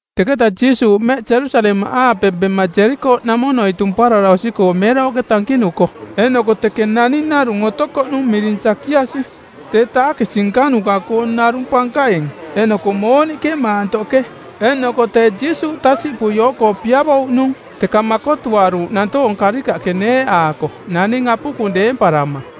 Teketa Jiisuuꞌ mmeꞌ Jerusalemaꞌaape bema Jerikooꞌnamonoi tumparara osi-koo meerooꞌke tankinuko, eeꞌnoko teke naning narung otokoꞌnung miring Sakiasi; Tee taakisi nkanuka-koong narung pankaing, eeꞌnoko mooniꞌke maantoꞌke. Eeꞌnoko tee Jiisuuꞌ tasiꞌpui oo-koo piavouꞌnung, teka makotuaruuꞌ nantoong karikaꞌke neeꞌaako naning apukung deemparama.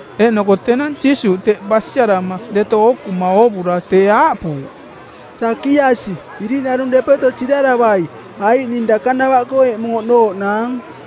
Eeꞌnoko tenang Jiisuuꞌ teꞌ basiarama deto ookuma oovura tee aaꞌpuuꞌ, “Sakiasi, iriꞌnarung depeto siraravai, aiꞌ ning dakanavaꞌkoo eꞌmung oꞌnooꞌnaang.”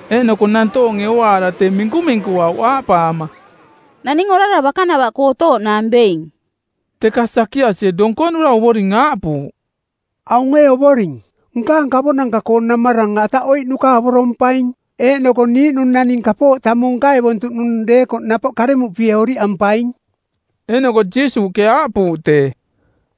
Eeꞌnoko nantoonge ooaara tee minkuminkuauꞌ aaꞌpaama, “Naning orara bakanava-koo otooꞌnaang being.” Teka Sakiasie donkonura Ovoring aaꞌpuuꞌ, “Aung ee Ovoring, nkaang kavonanka-koo namarang ataꞌoiꞌnuka avorompaing, eeꞌnoko niiꞌnung naning kapooꞌ tamung nkaevontuꞌnung deekoꞌ napoꞌ karemuꞌpie oriꞌampaing.” Eeꞌnoko Jiisuuꞌke aaꞌpuuꞌ tee,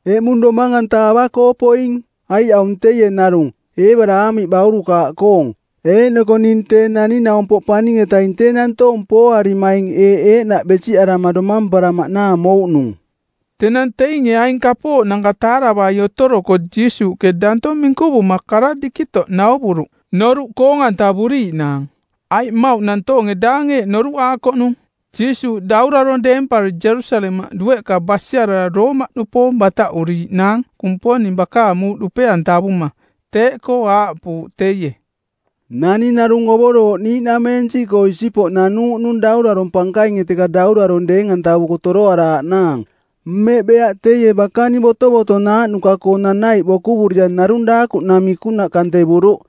“Eꞌmung domang-anta ava-koo poing, aiꞌ aung teie narung, Eebaraamiꞌ baurukaaꞌkoong. Eeꞌnoko ning Tee Naning-naumpoꞌ Paning-etaing tee nantoong pooarimaing eeꞌ eeꞌnaꞌ besiꞌarama domamparamaꞌnaang mouꞌnung.” Tenang teinge aing kapooꞌnanka taaravai otoroko Jiisuuꞌke danto minkuvuma kara dikitoꞌ nauvuruꞌ noruꞌ koong-antavuriiꞌnaang. Aiꞌ mmauꞌ nantoonge daang eeꞌ noruꞌaakoꞌnung, Jiisuuꞌ daurarong˜ deempari Jerusalemaꞌ dueꞌka basiarara Roomaꞌnupoong bataꞌuriiꞌnaang Kumponing bakaang muuꞌ dupe-antavuma. Teeꞌkoo aaꞌpuuꞌ teie, “Naning narung ovorooꞌ niiꞌnameensiꞌkoo isipoꞌ nanuuꞌnung daurarong pankainge teka daurarong deeng-antavuko toroaraaꞌnaang. Mmeꞌ beaꞌ teie bakaning botovotonaaꞌnuka-koo nanaiꞌ bokuvurira narung daakuꞌnamikunaꞌ kantevuruꞌ.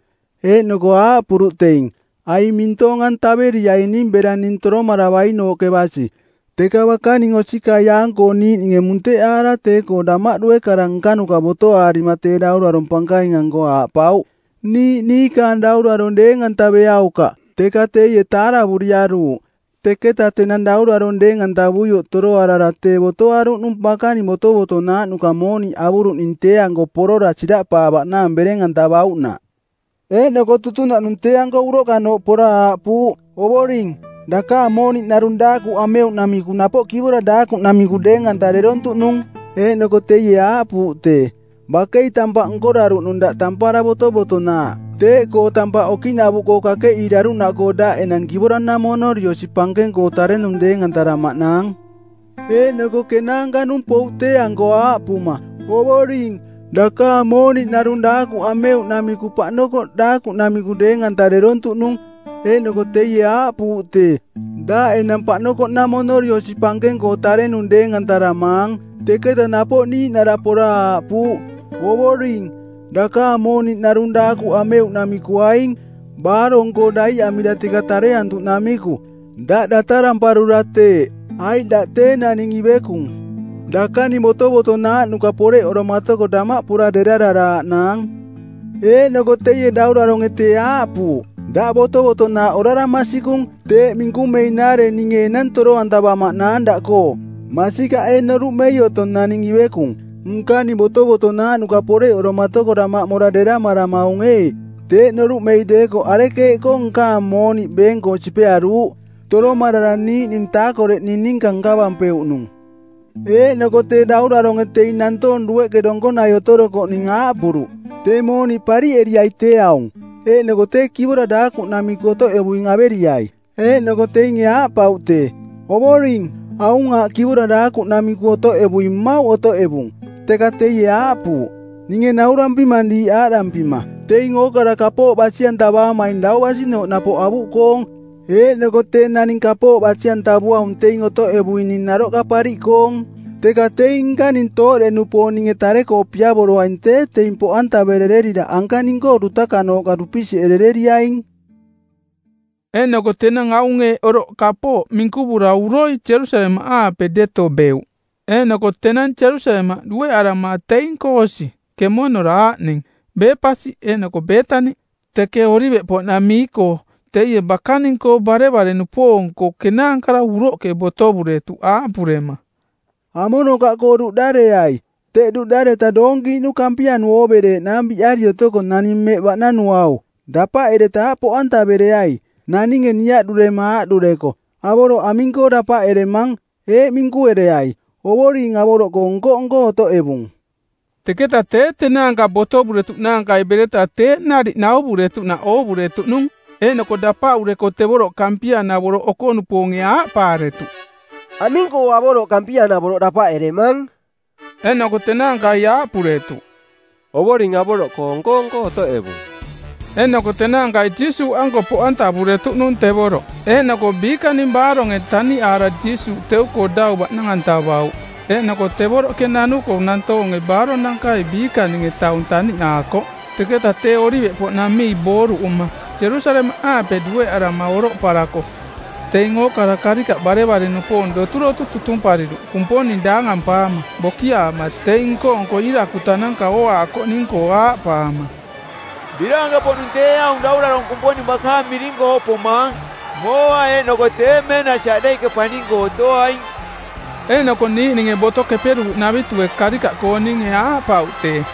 Eeꞌnoko aaꞌpuruꞌ teing, ‘Aing mintoong-antaveriaining bera ning toromaravainooꞌke basi.’ Teka bakaning osikaiaang-koo niiꞌninge munteꞌaara tee-koo damaꞌdue kara nkanuka botoaarima tee daurarong pankaing-anko aaꞌpauꞌ, ‘Niiꞌ niikaang daurarong deeng-antaveaukaꞌ.’ Teka teie taaravuriaruuꞌ. “Teketa tenang daurarong deeng-antavuioꞌ toroarara tee botoaruꞌnung bakaning botovotonaaꞌnuka mooniꞌ avuruꞌning tee-anko porora siraꞌpaavaꞌnaang bereng-antavauꞌnaꞌ. Eeꞌnoko tutunaꞌnung tee-anko uroꞌkanooꞌ pora aaꞌpuuꞌ, ‘Ovoring, dakaang mooniꞌ narung daakuꞌ ameuꞌnamiku napoꞌ kivora daakuꞌnamiku deeng-antarerontuꞌnung.’ Eeꞌnoko teie aaꞌpuuꞌ tee, ‘Bakei tampaꞌ nkoraruꞌnung daꞌ tampara botovotonaaꞌ. Teeꞌkoo tampaꞌ okiꞌnavuꞌkoo kakeꞌiiraruꞌnaꞌkoo daꞌ enang kivora-namonori osi pankeng-koo tarenung deeng-antaramaang.’ “Eeꞌnoko kenaanka-nung pouꞌ tee-anko aaꞌpuma, ‘Ovoring, dakaang mooniꞌ narung daakuꞌ ameuꞌnamiku paꞌnokoꞌ daakuꞌnamiku deeng-antarerontuꞌnung.’ Eeꞌnoko teie aaꞌpuuꞌ tee, ‘Daꞌ enang paꞌnokoꞌnamonori osi pankeng-koo tarenung deeng-antaramaang.’ “Teketa napoꞌ niiꞌnara pora aaꞌpuuꞌ, ‘Ovoring, dakaang mooniꞌ narung daakuꞌ ameuꞌnamiku aing, baarong-koo daiꞌamira teka tareantuꞌnamiku. Daꞌ dataramparura teeꞌ, aiꞌ daꞌ tee naning ivekung. Dakaning botovotonaaꞌnuka poreꞌoromaatoko damaꞌ pora derararaaꞌnaang.’ Eeꞌnoko teie dauraronge tee aaꞌpuuꞌ, ‘Daꞌ botovotonaaꞌ orara masikung, teeꞌ minkumeinaare ninge enang toro-antavamaꞌnaang daꞌkoo. Masikaꞌ ee noruꞌmei otong naning ivekung? Nkaning botovotonaaꞌnuka poreꞌoromatoko damaꞌ mora deramaramaung ee? Teeꞌ noruꞌmei deekoꞌ arekeeꞌkoo nkaang mooniꞌ beeng-koo sipearuuꞌ, toromarara niiꞌning taakoreꞌning ninka nkavampeuꞌnung?’ “Eeꞌnoko tee dauraronge teing nantoong dueꞌke donkonai otorokoꞌning aaꞌpuruꞌ, ‘Tee mooniꞌ pariꞌeriai tee aung, eeꞌnoko tee kivora daakuꞌnamiku otoꞌevuing averiai.’ Eeꞌnoko teinge aaꞌpauꞌ tee, ‘Ovoring, aung aaꞌ kivora daakuꞌnamiku otoꞌevuing mmauꞌ otoꞌevung.’ Teka teie aaꞌpuuꞌ, ‘Ninge naurampimang diiꞌ aaꞌdampima, teing ookara kapooꞌ basi-antavaamaing dau basinooꞌ napoꞌ avuꞌkoong, eeꞌnoko tee naning kapooꞌ basi-antavuaung teing otoꞌevuining naroꞌka pariꞌkoong. Teka teing nkaning tooꞌde-nupoong ninge tare-koo piavoroaing tee teing poꞌantavererira anka ning-koo dutakanooꞌka dupisiꞌerereriaing.’” Eeꞌnoko tenang aung eeꞌ oroꞌ kapooꞌ minkuvura uroi Jerusalemaꞌaape deto beuꞌ. Eeꞌnoko tenang Jerusalemaꞌ dueꞌarama teing-koo osi kemonora aaꞌning Bepasi eeꞌnoko Beetani teke Oliveꞌpoꞌnamii-koo teie bakaning-koo barevare-nupoong-koo kenaankara uroꞌke botovuretuꞌ aaꞌpurema, “Amonokaꞌkoo duꞌdareai. Teꞌ duꞌdareta doonkiiꞌnu kampianu oovereeꞌnaang biꞌari otoko naning mmeꞌ baꞌnanuau. Dapaꞌereta aꞌ poꞌantavereai. Naninge niaꞌdurema aaꞌdureko, ‘Avoroꞌ aming-koo dapaꞌeremang?’ eeꞌ minkuereai, ‘Ovoring avoroꞌkoo nko-nko otoꞌevung.’” Teketa tee tenaanka botovuretuꞌnaankai bereta teeꞌ nariꞌ nauvuretuꞌnaꞌ oovuretuꞌnung. Eeꞌnoko dapaꞌureko tevoroꞌ kampia-navoroꞌ oko-nupoonge aaꞌpaaretuꞌ, “Aming-koo avoroꞌ kampia-navoroꞌ dapaꞌeremang?” Eeꞌnoko tenaankai aaꞌpuretuꞌ, “Ovoring avoroꞌkoo nko-nko otoꞌevung.” Eeꞌnoko tenaankai Jiisuuꞌanko poꞌantavuretuꞌnung tevoroꞌ, eeꞌnoko biikaang baaronge taniꞌaara Jiisuuꞌ teu-koo dau baꞌnang-antavauꞌ. Eeꞌnoko tevoroꞌke nanuko nantoonge baaronankai biikaninge taung taniꞌaakoꞌ. Teketa tee Oliveꞌpoꞌnamii booruꞌuma˜ Jerusalemaꞌaape dueꞌarama oroꞌparako teing ookara karikaꞌ barevare-nupoong doturotu tutumpariruꞌ Kumponing daangampaama bokiaama teing nko-nko iirakutananka ooaakoꞌning-koo aaꞌpaama, “Biraanke-poꞌnung tee aung daurarong Kumponing bakaang miring-koo pomaang! Mooa eeꞌnoko tee meenasi aꞌdeiꞌke paning-koo otoaing.” Eeꞌnoko niiꞌninge Boto Keperuuꞌnavitue karikaꞌkooninge aaꞌpauꞌ tee,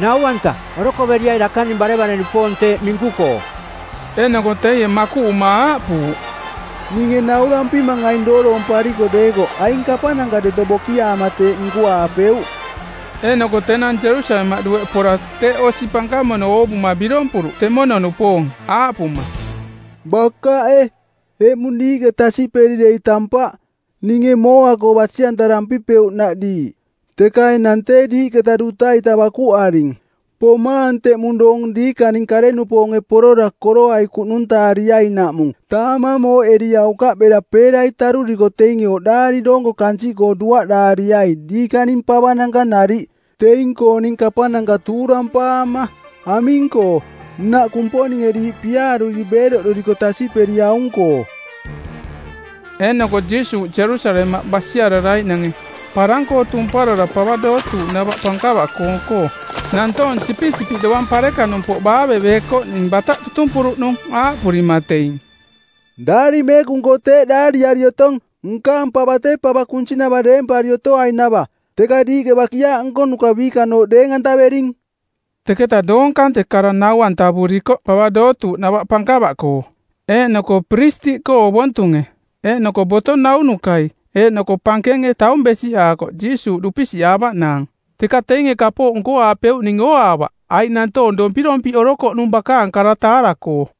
“Nau-anta, orokoveriai dakaning barevare-nupoong teeꞌ minku-koo.” Eeꞌnoko teie makuꞌuma aaꞌpuuꞌ, “Ninge naurampimang aing dooroompariko deekoꞌ aing kapananka deto bokiaama teeꞌ minkuaapeuꞌ.” Eeꞌnoko tenang Jerusalemaꞌ dueꞌ pora teꞌ osi pankamono oovuma birompuruꞌ temono-nupoong, aaꞌpuma, “Bakaꞌe, eꞌmung diiꞌke tasiꞌperi dei tampaꞌ, ninge mooa-koo basi-antarampipeuꞌnaꞌ diiꞌ, teka enang tee diiꞌketa duta-ita bakuꞌaring. Pomaang teꞌmung doong tenang diikaning kare-nupoonge porora kororai kuꞌnuntaariainaꞌmung taamang mooꞌeriaukaꞌ bera peerai taruriko teinge oꞌdaari doonko kansiꞌkoo duaꞌraariai diikaning pavananka nariꞌ, teing-kooning kapananka tuurampaama; Aming-koo, nnaꞌ Kumponinge diiꞌ piaaruri beeroꞌduriko tasiꞌperiaung-koo.” Eeꞌnoko Jiisuuꞌ Jerusalemaꞌ basiararaiꞌnange, parang-koo tumparara pava dootuuꞌnava pankava-koong-koo, nantoong sipisipiꞌ dovang parekanumpoꞌ baaveveekoꞌning bataꞌ tutumpuruꞌnung. aaꞌpurima teing, “Daari Meekung-koo tee eeꞌ daariari otong, ‘Nkaang pava tee pava kunsinava deempari otoainava.’ Teka diiꞌke ‘bakiaaꞌ nkonuka biikanooꞌ’ deeng-antavering.” Teketa doong kante kara nau-antavurikoꞌ pava dootuuꞌnava pankava-koo. Eeꞌnoko piristiꞌkoo ovontunge eeꞌnoko boto naunukai eeꞌnoko pankenge taung besiꞌaakoꞌ Jiisuuꞌ dupisiꞌaavaꞌnaang. Teka teinge kapooꞌ nkoaapeuꞌning ooaavaꞌ, aiꞌ nantoong dompirompiꞌorokoꞌnung bakaang kara taara-koo.